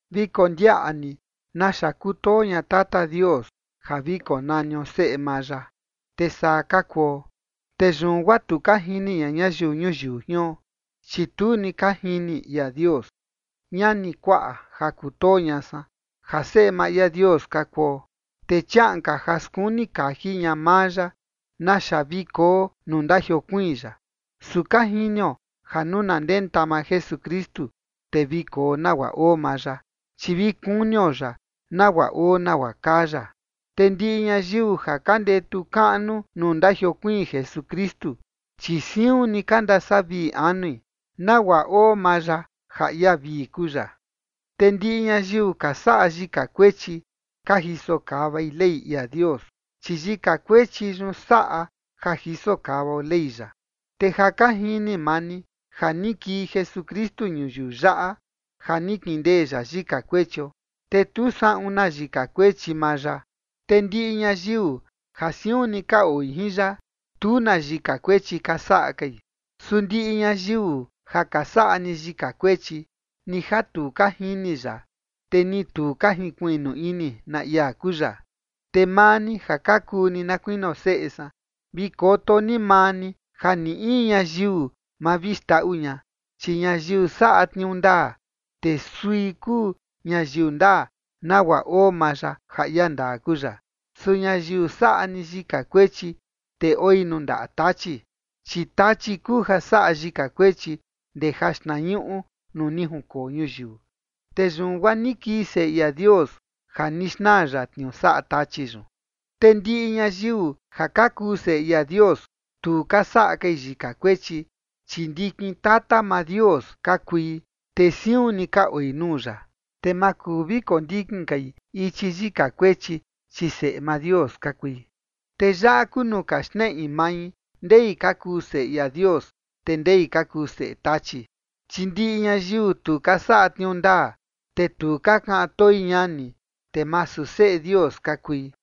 Vi kondiaꞌa ni naxa kutoo ña Tata Dios, ja vi konanio seꞌe maa ya, te saa ka kuo. Te yun guaa tu ka jini ña ñayiu ñuyiu jion, chi tu ni ka jini ia Dios. Ñani kuaꞌa ja kutoo ña san, ja seꞌe maa ia Dios ka kuo, te chiaꞌan ka ja skuni kaji ña maa ya naxa vi koo nuu ndajiokuiin ya. Su ka jinio ja nuu na ndenta maa Jesukristu, te vi koo nagua oo maa ya, chi vi kunio ya, nagua oo nagua kaa ya. Te ndiꞌi ñayiu ja ka ndetu kaꞌnu nuu ndajiokuiin Jesukristu, chi siun ni ka ndasavii anui, nagua oo maa ya ja ia vii kuu ya. Te ndiꞌi ñayiu ka saꞌa yika kuechi, ka jiso kavai Ley ia Dios, chi yika kuechi yun saꞌa ja jiso kavao Ley ya. Te ja ka jini maa ni ja ni kii Jesukristu ñuyiu yaꞌa ja ni kindee ya yika kuechio, te tu saꞌun na yika kuechi maa ya. Te ndiꞌi ñayiu ja siun ni ka oi jin ya, tu na yika kuechi ka saꞌa kai. Su ndiꞌi ñayiu ja ka saꞌa ni yika kuechi, ni ja tu ka jini ya, te ni tu ka jinkuiꞌnu ini na ia kuu ya. Te maa ni ja ka kuu ni na kuinio seꞌe san, vi koto ni maa ni ja ni in ñayiu ma vi xndaꞌu ña, chi ñayiu saꞌa tniuu ndaa, te sui kuu ñayiu ndaa, nagua oo maa ya ja ia ndaa kuu ya. Su ñayiu saꞌa ni yika kuechi, te oi nuu ndaꞌa Tachi, chi Tachi kuu ja saꞌa yika kuechi ndee jaxtnañuꞌu nuu ni junkoo ñuyiu. Te yun guaa ni kii Seꞌe ia Dios ja ni xnaa ya tniuu saꞌa Tachi yun. Te ndiꞌi ñayiu ja ka kuu seꞌe ia Dios, tu ka saꞌa kai yika kuechi, chi ndikin tata maa Dios ka kui, te siun ni ka oi nuu ya, te ma kuu vi kondikin kai ichi yika kuechi, chi seꞌe maa Dios ka kui. Te yaꞌa kuu nuu ka xneꞌi mai ndei ka kuu seꞌe ia Dios, te ndei ka kuu seꞌe Tachi, chi ndiꞌi ñayiu tu ka saꞌa tniuu ndaa, te tu ka kaꞌan toi ñani, te masu seꞌe Dios ka kui.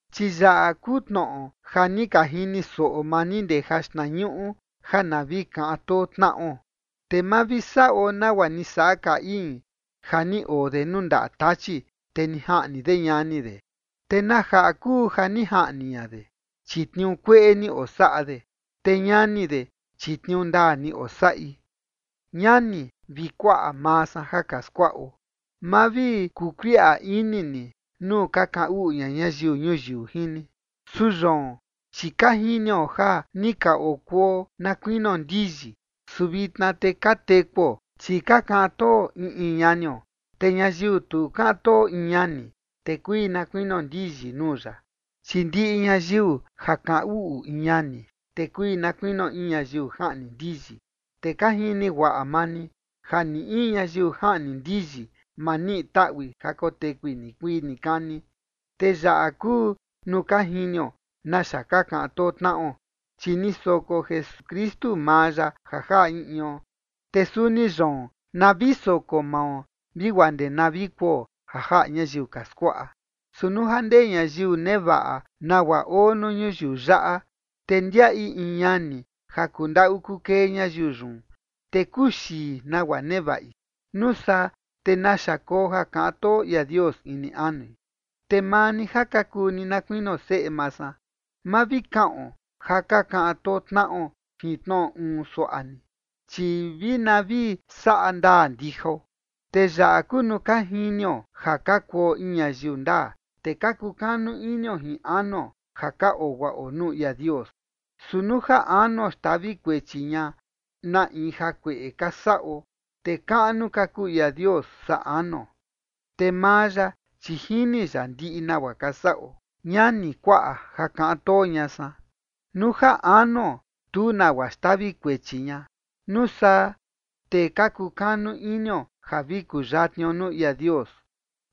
Chi yaꞌa kuu tnoꞌo ja ni ka jini soꞌo maa ni ndee jaxtnañuꞌu, ja na vi kaꞌan too tnaꞌo. Te ma vi saꞌo nagua ni saꞌa Caín, ja ni oo de nuu ndaꞌa Tachi, te ni jaꞌni de ñani de. ¿Te na jaꞌa kuu ja ni jaꞌni ña de? Chi tniuu kueꞌe ni osaꞌa de, te ñani de, chi tniuu ndaa ni osaꞌi. Ñani vi kuaꞌa maa san ja ka skuaꞌo, ma vi kukuiꞌa ini ni nuu ja ka kaꞌan uꞌu ña ñayiu ñuyiu jin ni. Su yoon, chi ka jinio ja ni ka okuo na kuinio ndiyi, su vitna te ka tekuo, chi ka kaꞌan too in in ñanio. Te ñayiu tu kaꞌan too in ñani, te kui na kuinio ndiyi nuu ya. Chi ndiꞌi ñayiu ja kaꞌan uꞌu in ñani, te kui na kuinio in ñayiu jaꞌni ndiyi, te ka jini guaꞌa maa ni ja ni in ñayiu jaꞌni ndiyi, ma niꞌi taꞌui ja kotekui nikuii nikani. Te yaꞌa kuu nuu ka jinio naxa ka kaꞌan too tnaꞌo, chi ni soko Jesukristu maa ya ja jaꞌa in ion, te suni yoon, na vi soko mao vi guaa ndee na vi kuo ja jaꞌa ñayiu ka skuaꞌa. Su nuu ja ndee ñayiu nevaꞌa nagua oo nuu ñuyiu yaꞌa, te ndiaꞌi in ñani ja kundaꞌu kukee ñayiu yun, te kuxii nagua nevaꞌi, ¿nuu saa te naxa koo ja kaꞌan too ia Dios ini anui? Te maa ni ja ka kuu ni na kuinio seꞌe maa san, ma vi kaꞌon ja ka kaꞌan too tnaꞌo jin tnoꞌo uun suaꞌa ni, chi vi na vi saꞌa ndaa ndijao. Te yaꞌa kuu nuu ka jinio ja ka kuo in ñayiu ndaa, te ka kukanu inio jin anuo ja ka oo guaꞌo nuu ia Dios. Su nuu ja anuo xtavi kuechi ña na in jakueꞌe ka saꞌo, te kaꞌnu ka kuu ia Dios saa anuo, te maa ya, chi jini ya ndiꞌi nagua ka saꞌo. Ñani kuaꞌa ja kaꞌan too ña san, nuu ja anuo, tu nagua xtavi kuechi ña, nuu saa te ka kukanu inio ja vi kuyatnio nuu ia Dios.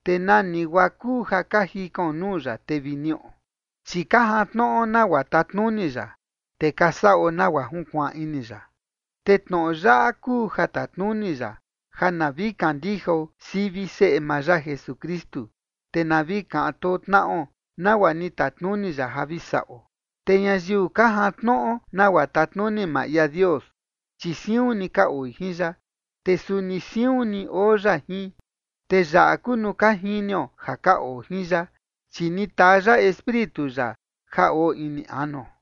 Te nani guaa kuu ja ka jikaon nuu ya, te vi niꞌo, chi ka jantnoꞌo nagua tatnuni ya, te ka saꞌo nagua junkuaan ini ya. Te tnoꞌo yaꞌa kuu ja tatnuni ya, ja na vi kandijao sivi Seꞌe maa ya Jesukristu, te na vi kaꞌan too tnaꞌo, nagua ni tatnuni ya ja vi saꞌo. Te ñayiu ka jantnoꞌo nagua tatnuni maa ia Dios, chi siun ni ka oi jin ya, te suni siun ni oo ya jin. Te yaꞌa kuu nuu ka jinio ja ka oo jin ya, chi ni taa ya Espíritu ya ja oo ini anuo.